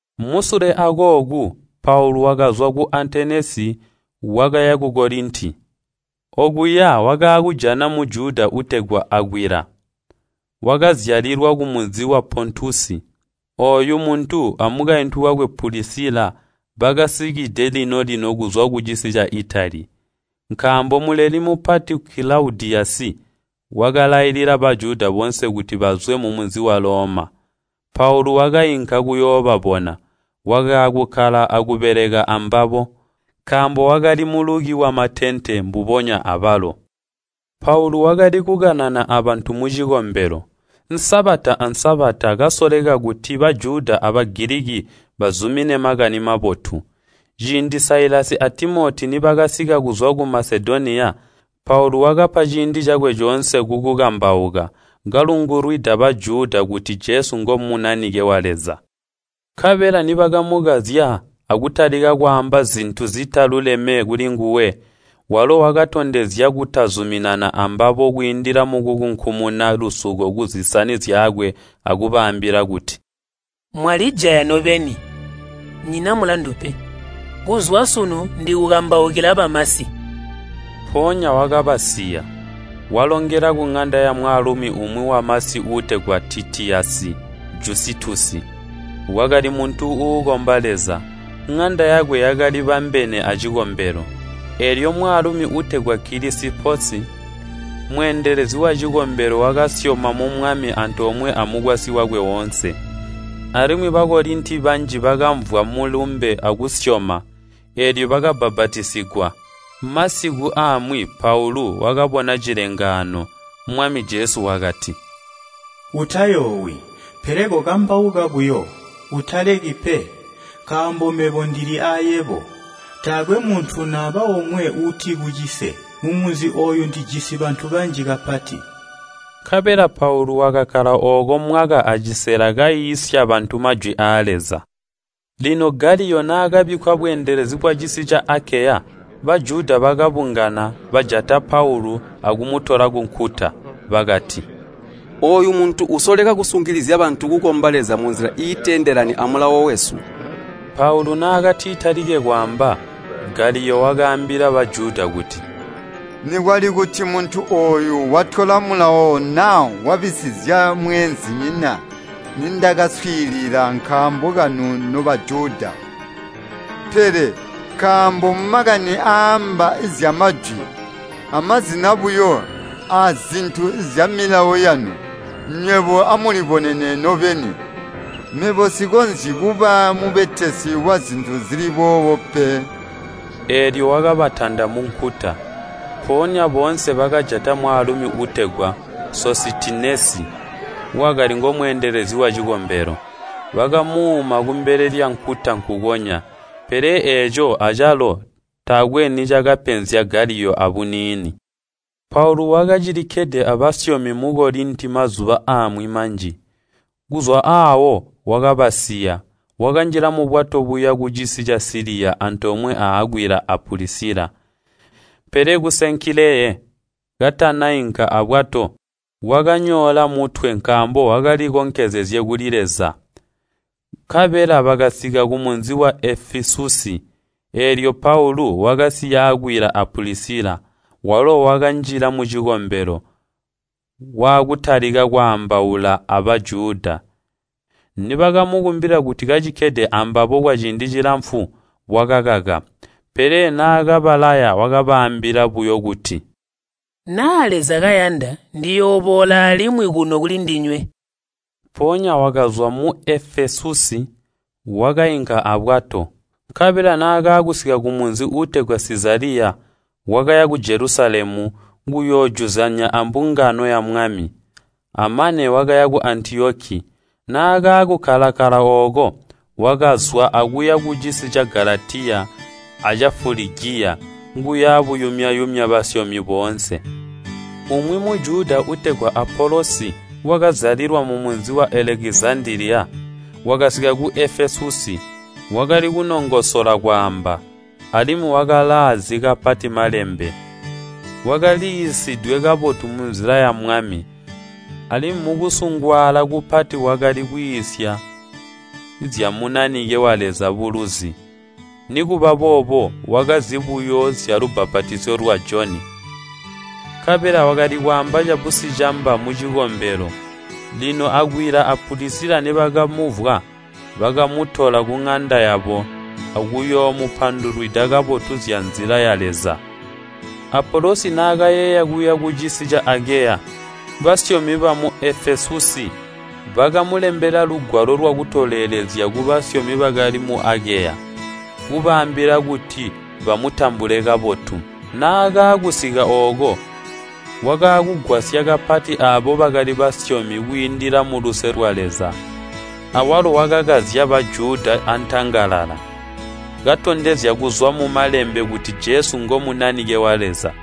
Musule akooku, Paulu wakazwa ku Atenesi, wakaya ku Kolinti. Okuya wakaakujana Mujuda uutegwa Akwila, wakazyalilwa kumunzi wa Pontusi. Ooyu muntu amukaintu wakwe Pulisila bakacisikide lino-lino kuzwa kucisi ca Itali, nkaambo Muleli Mupati Kilaudiyasi wakalailila Bajuda boonse kuti bazwe mumunzi wa Loma. Paulu wakainka kuyoobabona, wakaakukkala akubeleka ambabo, nkaambo wakali muluki wa matente mbubonya abalo. Paulu wakali kukanana abantu mucikombelo, Sabata a Sabata, kasoleka kuti Bajuda a Bagiliki bazumine Makani Mabotu. Ciindi Sailasi a Timoti nibakasika kuzwa ku Masedoniya, Paulu wakapa ciindi cakwe coonse kukukambauka, kalungulwida Bajuda kuti Jesu ngo Munanike wa Leza. Nkabela nibakamukazya akutalika kwaamba zintu zitaluleme kulinguwe, walo wakatondezya kutazuminana ambabo kwiindila mukukunkumuna lusuko kuzisani zyakwe akubaambila kuti, “Mwalijaya nobeni! Nyina mulandu pe. Kuzwa sunu ndikukambaukila bamasi.” Mpoonya wakabasiya, walongela kuŋanda yamwaalumi umwi wamasi uutegwa Titiyasi Jusitusi, wakali muntu uukomba Leza. Ŋanda yakwe yakalibambene acikombelo. Eelyo mwaalumi uutegwa Kilisiposi, mweendelezi wacikombelo wakasyoma mu Mwami antoomwe amukwasyi wakwe oonse. Alimwi Bakolinti banji bakamvwa mulumbe akuusyoma, eelyo bakabbapatizigwa. Masiku amwi Paulu wakabona cilengaano. Mwami Jesu wakati, “Utayoowi, pele kokambauka buyo, utaleki pe, nkaambo mebo ndili aayebo. Taakwe muntu naba omwe uutikucise. Mumunzi ooyu ndijisi bantu banji kapati.” Nkabela Paulu wakakkala ooko mwaka acisela kaiisya bantu majwi aa Leza. Lino Galiyo naakabikkwa bweendelezi bwacisi ca Akeya, Bajuda bakabungana, bajata Paulu akumutola kunkuta. Bakati, “Ooyu muntu usoleka kusungilizya bantu kukomba Leza munzila iiteendelani amulawo wesu!” Paulu naakatitalike kwaamba, Galiyo wakaambila Bajuda kuti, “Nikwali kuti muntu ooyu watyola mulawo naa wabisizya mweenzinyina nindakaswiilila kaambo kanu no Bajuda. Pele nkaambo makani aaamba zyamajwi, amazina buyo aazintu zyamilawo yanu, nywebo amulibonene nobeni. Mebo nsikonzyi kuba mubetesi wazintu zili boobo pe!” Eelyo wakabatanda munkuta. Mpoonya boonse bakajata mwaalumi uutegwa Sositinesi, wakali ngomweedelezi wacikombelo, bakamuuma kumbele lyankuta nkukonya. Pele eeco acalo taakwe anicakapenzya Galiyo abuniini. Paulu wakacilikkede abasyomi mu Kolinti mazuba amwi manji. Kuzwa aawo wakabasiya, wakanjila mubwato buya kucisi ca Siliya antoomwe a Akwila a Pulisila. Pele ku Senkileye katanainka abwato, wakanyoola mutwe nkaambo wakalikonkezezye kuli Leza. Nkabela bakasika kumunzi wa Efesusi, eelyo Paulu wakasiya Akwila a Pulisila, walo wakanjila mucikombelo, waakutalika kwaambaula a Bajuda. Nibakamukumbila kuti kacikkede ambabo kwaciindi cilamfu, wakakaka. Pele naakabalaya wakabaambila buyo kuti, “Naa Leza kayanda ndiyooboola alimwi kuno kulindinywe.” Mpoonya wakazwa mu Efesusi, wakainka abwato. Nkabela naakaakusika kumunzi uutegwa Sizaliya, wakaya ku Jelusalemu kuyoojuzyanya abambungano ya Mwami, amane wakaya ku Antiyoki. Naakakkala-kkala ooko, wakazwa akuya kucisi ca Galatiya aca Fuligiya kuya buyumya-yumya basyomi boonse. Umwi Mujuda uutegwa Apolosi, wakazyalilwa mumunzi wa Elekizandaliya, wakasika ku Efesusi. Wakali kunongosola kwaamba, alimwi wakalaazi kapati Malembe. Wakaliiisidwe kabotu munzila ya Mwami, alimwi mukusungwaala kupati wakali kwiisya zya Munanike wa Leza buluzi. Nikubaboobo wakazi buyo zyalubbapatizyo lwa Joni. Nkabela wakali kwaamba cabusicamba mucikombelo. Lino Akwila a Pulisila nibakamumvwa, bakamutola kuŋanda yabo akuyoomupandulwida kabotu zya Nzila ya Leza. Apolosi naakayeeya kuya kucisi ca Akeya, basyomi bamu Efesusi bakamulembela lugwalo lwakutolelezya kubasyomi bakali mu Akeya, kubaambila kuti bamutambule kabotu. Naakaakusika ooko, wakaakugwasya kapati aabo bakali basyomi kwiindila muluse lwa Leza. Awalo wakakazya Bajuda antangalala, katondezya kuzwa mu Malembe kuti Jesu ngo Munanike wa Leza.